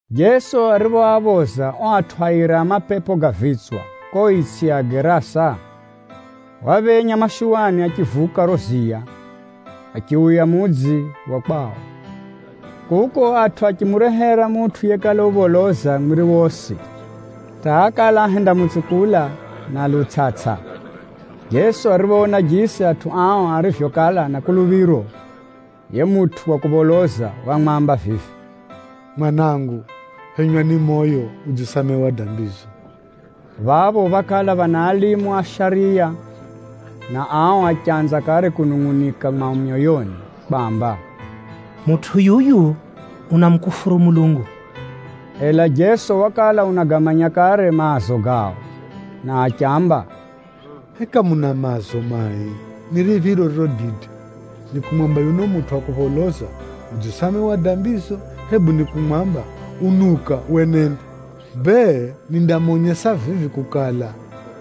Jeso ariphoaphoza ao atʼu airi a mapepo ga vitswa kuko itsʼi ya Agerasa, waphenya mashuwani achivuka riro ziya, achiuya mudzi wa kwao. Kuko atʼu achimurehera mutʼu yekala upholoza mwiri wosi, hata ákala ahendamutsukula na lutsʼatsʼa. Jeso ariphoona jisi atʼu ao arivyokala na kuluphiro, yiye mutʼu wa kupholoza wamwamba vivi, “Mwanangu, phenywa ni moyo! Udzisamehewa dambizo.” Phapho phákala phana kahi za alimu a shariya anjine, na ao achanza kare kunungʼunika mwao myoyoni kwamba, “Mutʼu yuyu unamukufuru Mulungu!” Ela Jeso wakala unagamanya kare maazo gao, na achiamba, “Heka muna maazo mai? Ni riphiro ririro dide, ni kumwamba yuno mutʼu wa kupholoza, ‘Udzisamehewa dambizo,’ hebu ni kumwamba, ‘Unuka, wenende’? Bee, vivi nindamonyesa kukala,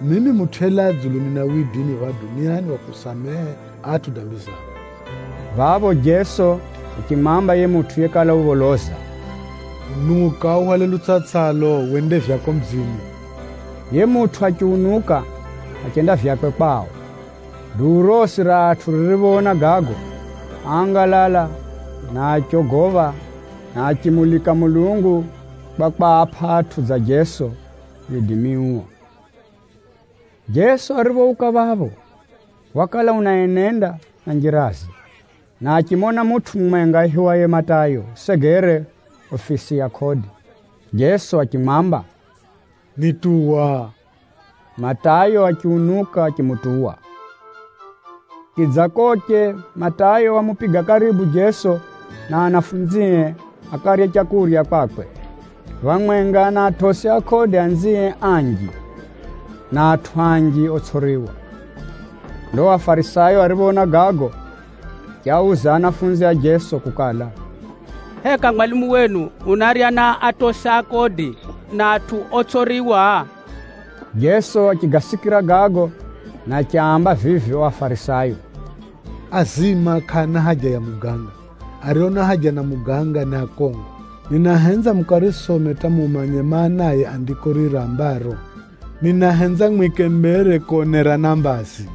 mimi Mutʼu yelaa dzulu nina widimi phapha duniani wa kusamehe atʼu dambi zao.” Phapho Jeso achimwamba yiye mutʼu yekala upholoza vivi, “Unuka uhwale lutsʼatsʼalo, wende vyako mudzini.” Yiye mutʼu achiunuka, achenda vyakwe kwao. Duu rosi ra atʼu ririphoona gago, áangalala na achogopha, na achimulika Mulungu kwa kwapʼa atʼu dza Jeso widimi uo. Jeso ariphouka phapho, wakala unaenenda na njiraze, na achimona mutʼu mumwenga aihiwaye Matayo usegere ufisi ya kodi. Jeso achimwamba, “Nituwa!” Matayo achiunuka achimutuwa. Chidzakoche, Matayo wamupiga karibu Jeso na anafunzie akarye leu kwakwe, phamwenga na atosi a kodi anzie anji, na atʼu anji otsʼiriwa. Ndo Afarisayo ariphoona gago, achiauza anafunzi a Jeso kukala, “Heka mwalimu wenu unarya na atosi a kodi na atʼu otsʼiriwa?” Jeso achigasikira gago na achiaamba vivi ao Afarisayo, “Azima kʼaana haja ya muganga, ario na haja na muganga ni akongo. Ninahenza mukarisome hata mumanye maanaye Andiko riri rambaro, ‘Ninahenza mwike mbere konerana mbazi,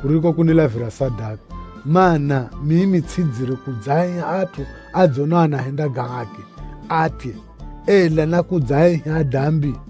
kuriko kunilavira sadaka.’ Maana, mimi tsʼidzire kudzaaiha atʼu adzonao anahenda ga haki atye, ela nákudzaaiha adambi.”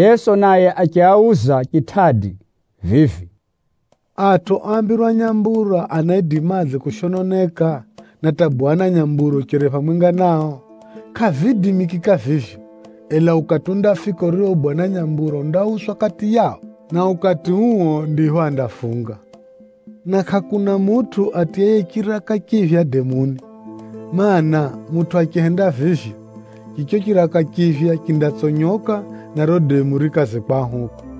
Jeso naye achiauza chitʼadi vivi, “Atʼu oambirwa nyambura anaidimadze kushononeka, na hata bwana nyambura ucheri phamwenga nao? Kʼaviidimikika vivyo. Ela ukati undafika urio bwana nyambura undauswa kati yao, na ukati uo ndipho andafunga. “Na kʼakuna mutʼu atiyaye chiraka chiphya demuni. Maana, mutʼu achihenda vivyo, chicho chiraka chiphya chindatsonyoka, na riro demu rikaze kwahuka.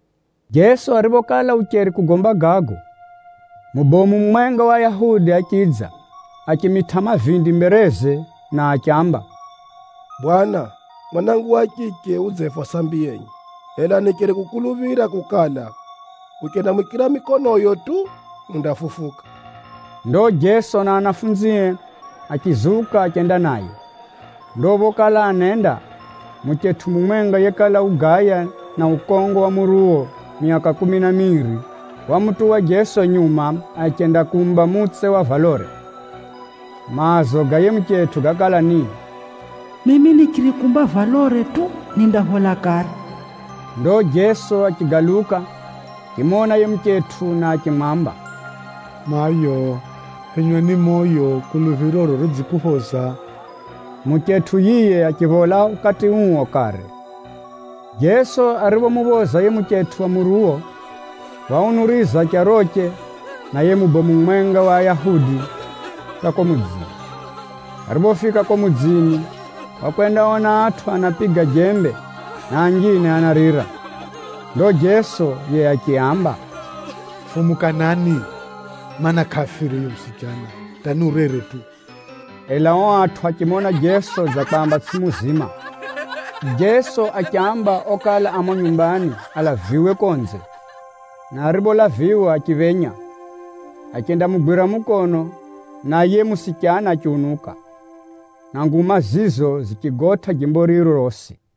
Jeso ariphokala ucheri kugomba gago, mubomu mumwenga wa Ayahudi achidza. Achimitʼa mavindi mbereze na achiamba, “Bwana, mwanangu wa chiche udzefa sambi yenye. Ela nicheri kukuluphira kukala, uchendamwikira mikonoyo tu, undafufuka.” Ndo Jeso na anafunzie achizuka achenda naye. Ndo phokala anenda, muchetʼu mumwenga yekala ugaya na ukongo wa muruwo myaka kumi na miri, wamutuwa Jeso nyuma achendakumba mutse wa valore. Maazo ga yiye muchetʼu gákala ni, “Mimi nichirikumba valore tu, nindaphola kare.” Ndo Jeso achigaluka, achimona yiye muchetʼu na achimwamba, “Mayo, phenywa ni moyo! Kuluphiroro ridzikuphoza.” Muchetʼu yiye achiphola ukati uo kare. Jeso ariphomuphoza yiye muchetʼu wa muruwo, waunuriza charoche na yiye mubomu mumwenga wa Ayahudi hata kuko mudzini. Ariphofika kuko mudzini, wakwendaona atʼu anapiga jembe, na anjine anarira. Ndo Jeso yiye achiaamba, “Fumukanani, mana, kʼafire yuyu musichana, hata ni urere tu!” Ela ao atʼu achimona Jeso dza kwamba tsʼiye muzima. Jeso achiamba okala a mumo nyumbani alaviwe konze, na aripholaviwa, achiphenya, achendamugwira mukono, na yiye musichana achiunuka. Na nguma zizo zichigotʼa jimbo riro rosi.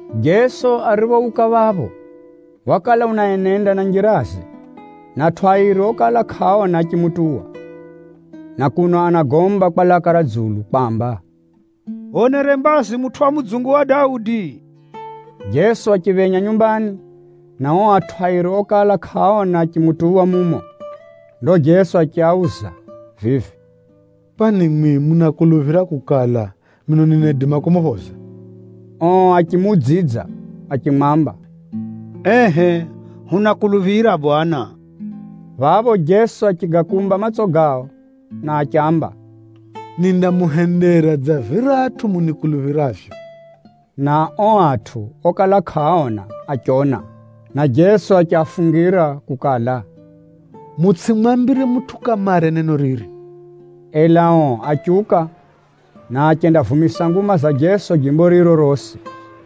Jeso ariphouka phapho, wakala unaenenda na njiraze, na atʼu airi okala kʼaaona achimutuwa, na kuno anagomba kwa laka ra dzulu kwamba, “Hwonere mbazi mutʼu wa mudzungu wa Daudi!” Jeso achiphenya nyumbani, na ao atʼu airi okala kʼaaona achimutuwa mumo. Ndo Jeso achiauza vivi, “Kwani mwimwi munakuluphira kukala, mino ninaidima kumuphoza?” Ao achimuudzidza achimwamba, “Ehʼe hunakuluphira Bwana.” Phapho Jeso achigakumba matso gao, na achiamba, “Nindamuhendera dza viratʼu munikuluphiravyo.” Na ao atʼu okala kʼaaona achiona. Na Jeso achiafungira kukala, “Mutsʼimwambire mutʼu kamare neno riri.” Ela ao achiuka, na achendavumisa nguma za Jeso jimbo riro rosi.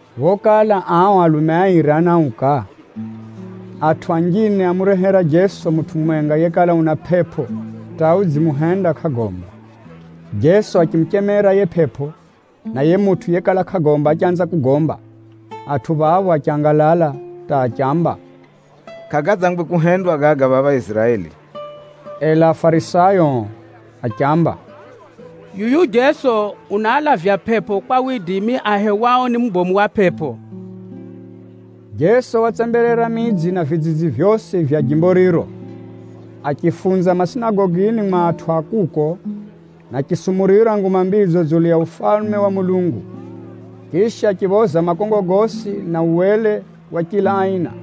Phokala ao alume airi anauka, atʼu anjine ámurehera Jeso mutʼu mumwenga yekala una pʼepʼo hata udzimuhenda kʼagomba. Jeso achimuchemera yiye pʼepʼo, na yiye mutʼu yekala kʼagomba achanza kugomba. Atʼu phapho achangalala hata achiamba, “Kʼagadzangwe kuhendwa gaga phapha Iziraeli!” Ela Afarisayo ao achiamba, “Yuyu Jeso unaalavya pʼepʼo kwa widimi ahewao ni mubomu wa pʼepʼo.” Jeso watsemberera midzi na vidzidzi vyosi vya jimbo riro, achifunza masinagogini mwa atʼu a kuko, na achisumurira Nguma Mbidzo dzulu ya Ufalume wa Mulungu. Chisha, achiphoza makongo gosi, na uwele wa chila aina.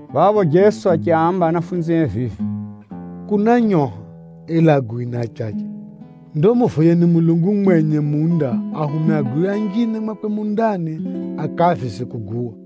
Phapho Jeso achiaamba anafunzie vivi, “Kuna nyoha, ela aguwi ni achache. Ndo muvoyeni Mulungu mwenye munda ahume aguwi anjine mwakwe mundani akaavize kuguwa.”